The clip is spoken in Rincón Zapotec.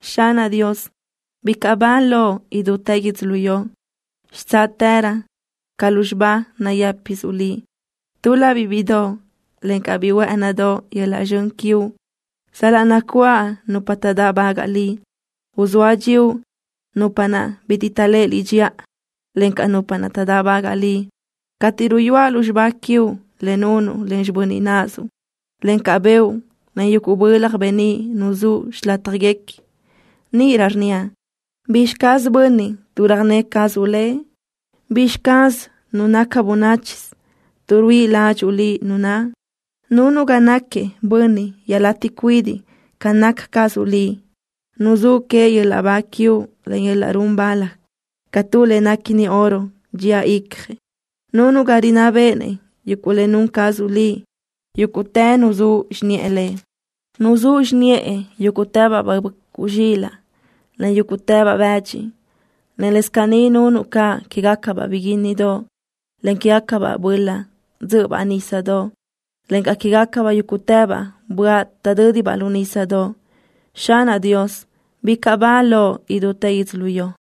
¡Xanaʼ Dios, bicaʼ ba Loʼ idútë yödzölió! ¡Xitsáʼtërö ca lúzxiba nayë́pisuʼ Liʼ! Túl-labiʼ bíʼidoʼ, encaʼ biʼi huë́ʼënidoʼ yöl-laʼ zxön quiuʼ sal-laʼ nacuáʼ nupa taʼdáʼbagaʼ Liʼ. Uzóa dxíuʼ nupa naʼ bitiʼ taʼléʼe Liʼ dxiʼa, encaʼ nupa taʼdáʼbagaʼ Liʼ. Cateʼ ruyúaʼ lúzxiba quiuʼ, le nunuʼ len xibö́n naʼzuʼ, encaʼ beuʼ, en yuguʼ bölaj beníʼ nuzúʼ xilátjaguequi, níʼirö rnníaʼ: ¿Bizxi caz bönniʼ, tuʼ röjné cazuʼ lëʼ? ¿Bizxi caz nu naca bönáchisö, tuʼ ruíʼi ládxuʼu Liʼ nu naʼ? Nunuʼ ga naquiëʼ bönniʼ iaʼlatiʼ cuidiʼ ca naca cazuʼ Liʼ. Nuzúʼ queëʼ yöl-laʼ ba quiuʼ, en yöl-laʼ run bal ca tu le néquini oro dxía icjëʼ. Nunuʼ ga rinná béʼenëʼ yuguʼ le nun cazuʼ Liʼ. Yúguʼtë nuzúʼ xiniʼë lëʼ. Nuzúʼ xiniʼë yúguʼtëbaʼ böʼcuʼ zxilaʼ, en yúguʼtëbaʼ bëdxi, en lës caní nunuʼ caʼ quégacabaʼ biguínnidoʼ, en quégacabaʼ böla dzö́ʼöbaʼ nísadoʼ, encaʼ quégacabaʼ yúguʼtëbaʼ böaʼ taʼdö́dibaʼ lu nísadoʼ. ¡Xanaʼ Dios, bicaʼ ba loʼ idútë yödzölió!